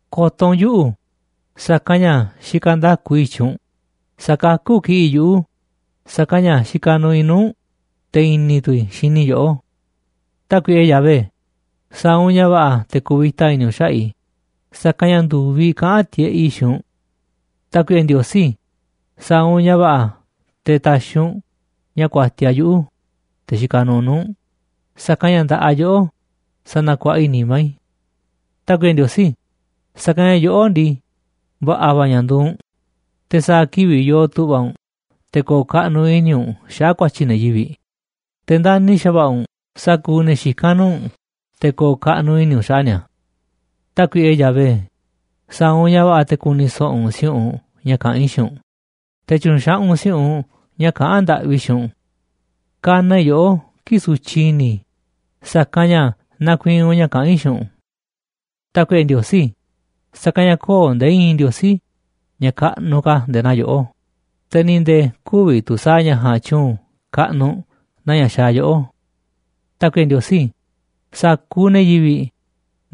Ko̱to̱ u̱nꞌ yuꞌu̱, sa̱kanꞌ ña̱ xikaꞌ nda̱ku i̱ i̱tyiꞌ u̱nꞌ, sa̱kakú kiꞌi̱ꞌ yuꞌu̱, sa̱kanꞌ ña̱ xikaꞌ nuuꞌ i̱ nuu̱ꞌ u̱nꞌ, te̱ i̱ni̱ tu̱ i̱ xini i̱ yoꞌó. Tákuiꞌe Yahvé, sa̱a̱ u̱nꞌ ña̱ va̱ꞌa̱ te̱ ku̱vi̱ta i̱ni̱ u̱nꞌ xaꞌa̱ꞌ i̱, sa̱kanꞌ ña̱ ndu̱viꞌ kaꞌán tiꞌeꞌ i̱ xiinꞌ u̱nꞌ. Tákuiꞌe Ndiosí, sa̱a̱ u̱nꞌ ña̱ va̱ꞌa̱ te̱ ta̱xi̱ u̱nꞌ ña̱ ku̱a̱tiaꞌ yuꞌu̱, te̱ xikaꞌ nuuꞌ nuu̱ꞌ u̱nꞌ, sa̱kanꞌ ña̱ nda̱ꞌaꞌ yoꞌó sanakuaꞌa i̱ nimá i̱. Tákuiꞌe Ndiosí, sa̱kanꞌ ña̱ yoꞌó ndii, va̱ꞌa̱ va̱ ña̱ nduuꞌ u̱nꞌ, te̱ sa̱a̱ kivi̱ꞌ yoo tu̱ꞌva̱ u̱nꞌ te̱ ko̱o̱ kaꞌnuꞌ i̱ni̱ u̱nꞌ xaꞌa̱ꞌ ku̱a̱tyi̱ ne̱ yivi̱ꞌ, te̱ ndani̱ xa̱va̱ꞌa̱ u̱nꞌ sa̱kuuꞌ ne̱ xikán nuu̱ꞌ u̱nꞌ te̱ ko̱o̱ kaꞌnuꞌ i̱ni̱ u̱nꞌ xaꞌa̱ꞌ ni̱a̱. Tákuiꞌe Yahvé, sa̱a̱ u̱nꞌ ña̱ va̱ꞌa̱ te̱ ku̱ni̱ so̱ꞌo̱ u̱nꞌ si̱u̱ꞌunꞌ ña̱ kaꞌán i̱ xiinꞌ u̱nꞌ, te̱ tyu̱nxaꞌaꞌ u̱nꞌ si̱u̱ꞌunꞌ ña̱ kaꞌán ndaꞌvi i̱ xiinꞌ u̱nꞌ. Kanaꞌ i̱ yoꞌó kii̱ꞌ sutyiꞌ i̱ni̱ i̱, sa̱kanꞌ ña̱ nakuiinꞌ u̱nꞌ ña̱ kaꞌán i̱ xiinꞌ u̱nꞌ. Tákuiꞌe Ndiosí, sa̱kanꞌ ña̱ köo̱ꞌ nde̱e̱ i̱i̱n ndiosí ña̱ kaꞌnuꞌ ka̱ nde̱e̱ naa yoꞌó, te̱ ni̱ nde̱e̱ kü̱vi̱ tu̱ sa̱a̱ ña̱ ja̱a̱nꞌ tyu̱u̱n kaꞌnuꞌ naa ña̱ xaaꞌ yoꞌó. Tákuiꞌe Ndiosí, sa̱kuuꞌ ne̱ yivi̱ꞌ,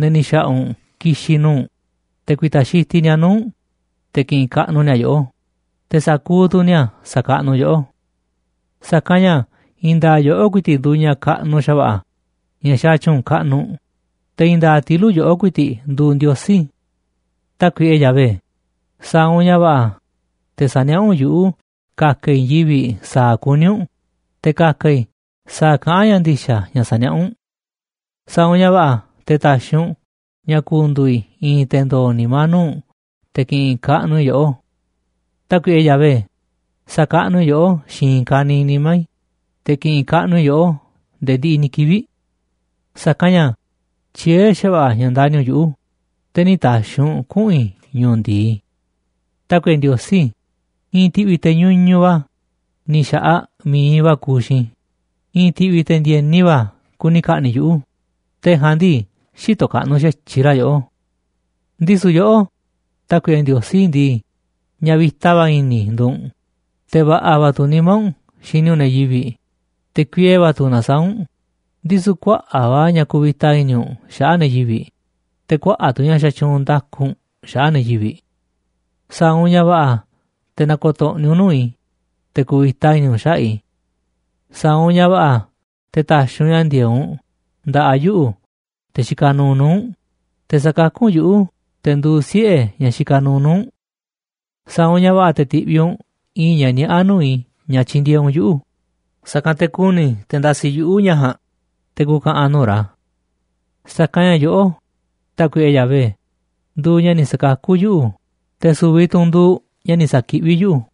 ne̱ ni̱ xa̱ꞌa̱ u̱nꞌ ki̱xi̱n nuu̱ꞌ u̱nꞌ, te̱ ku̱i̱ta̱ xitiꞌ ni̱a̱ nuu̱ꞌ u̱nꞌ, te̱ ki̱ꞌi̱n kaꞌnuꞌ ni̱a̱ yoꞌó, te̱ sa̱kuuꞌ tu̱ ni̱a̱ sa̱kaꞌnuꞌ yoꞌó. Sa̱kanꞌ ña̱ i̱i̱n nda̱a̱ꞌ yoꞌó ku̱i̱ti̱ꞌ nduuꞌ ña̱ kaꞌnuꞌ xa̱va̱ꞌa̱ ña̱ xaaꞌ tyu̱u̱n kaꞌnuꞌ, te̱ i̱i̱n nda̱a̱ꞌ tilu̱ꞌ yoꞌó ku̱i̱ti̱ꞌ nduuꞌ Ndiosí. Tákuiꞌe Yahvé, sa̱a̱ u̱nꞌ ña̱ va̱ꞌa̱ te̱ sa̱niaꞌá u̱nꞌ yuꞌu̱ ka̱ka̱ i̱ i̱i̱n yivi̱ꞌ sa̱a̱ kuní u̱nꞌ, te̱ ka̱ka̱ i̱ sa̱a̱ kaꞌán ña̱ ndi̱xa̱ ña̱ saniaꞌá u̱nꞌ. Sa̱a̱ u̱nꞌ ña̱ va̱ꞌa̱ te̱ ta̱xi̱ u̱nꞌ ña̱ ku̱ndu̱u̱ i̱ i̱i̱n te̱ ndo̱o̱ nimá nuu̱ꞌ u̱nꞌ te̱ ki̱ꞌi̱n kaꞌnuꞌ i̱ yoꞌó. Tákuiꞌe Yahvé, sa̱kaꞌnuꞌ i̱ yoꞌó xiinꞌ i̱i̱n ka̱niiꞌ nimá i̱, te̱ ki̱ꞌi̱n kaꞌnuꞌ i̱ yoꞌó nde̱e̱ ndiꞌiꞌ ni̱ kivi̱ꞌ. Sa̱kanꞌ ña̱ tyiee̱ xa̱va̱ꞌa̱ ña̱ ndani̱ u̱nꞌ yuꞌu̱, te̱ nï̱ ta̱xi̱ u̱nꞌ kuꞌu̱n i̱ ñu̱u̱ ndi̱i. Tákuiꞌe Ndiosí, i̱i̱n ti̱ꞌvi̱ te̱ ñuñuꞌ va̱ ni̱ xa̱ꞌaꞌ mi̱iꞌ va̱ kuuꞌ xiinꞌ i̱, i̱i̱n ti̱ꞌvi̱ te̱ ndi̱e̱ni va̱ kuni ka̱ꞌni̱ꞌ yuꞌu̱, te̱ ja̱a̱nꞌ ndii, xïtoꞌ kaꞌnuꞌ xa̱tyiꞌ ra̱ yoꞌó. Ndisu̱ yoꞌó, Tákuiꞌe Ndiosí ndii, ña̱ vi̱ta va̱ i̱ni̱ nduuꞌ u̱nꞌ, te̱ va̱ꞌa̱ va̱ tu̱ nimá u̱nꞌ xini u̱nꞌ ne̱ yivi̱ꞌ, te̱ kuiee va̱ tu̱ nasaáꞌ u̱nꞌ, ndisu̱ kuaꞌa̱ꞌ va̱ ña̱ kuvita i̱ni̱ u̱nꞌ xaꞌa̱ꞌ ne̱ yivi̱ꞌ, te̱ kuaꞌa̱ꞌ tu̱ ña̱ xatyuunꞌ nda̱ku u̱nꞌ xaꞌa̱ꞌ ne̱ yivi̱ꞌ. Sa̱a̱ u̱nꞌ ña̱ va̱ꞌa̱ te̱ na̱ko̱to̱ꞌni̱ u̱nꞌ nuu̱ꞌ i̱, te̱ ku̱vi̱ta i̱ni̱ u̱nꞌ xaꞌa̱ꞌ i̱. Sa̱a̱ u̱nꞌ ña̱ va̱ꞌa̱ te̱ ta̱xi̱ u̱nꞌ ña̱ ndi̱e̱eꞌ u̱nꞌ nda̱ꞌaꞌ yuꞌu̱, te̱ xikaꞌ nuuꞌ nuu̱ꞌ u̱nꞌ, te̱ sa̱kakú u̱nꞌ yuꞌu̱, te̱ nduuꞌ siꞌe̱ ñaꞌ xikaꞌ nuuꞌ nuu̱ꞌ u̱nꞌ. Sa̱a̱ u̱nꞌ ña̱ va̱ꞌa̱ te̱ ti̱ꞌviꞌ u̱nꞌ i̱i̱n ña̱ niaꞌá nuu̱ꞌ i̱ ña̱ tyindieeꞌ u̱nꞌ yuꞌu̱, sa̱kanꞌ te̱ ku̱ni̱ te̱ ndasiꞌ yuꞌu̱ ña̱ ja̱a̱nꞌ te̱ ku̱ka̱ꞌa̱n nuu̱ꞌ ra̱. Sa̱kanꞌ ña̱ yoꞌó, Tákuiꞌe Yahvé, nduuꞌ ña̱ ni̱ sa̱kakú yuꞌu̱, te̱ su̱vi̱ tu̱ u̱nꞌ nduuꞌ ña̱ ni̱ sa̱kiꞌví yuꞌu̱.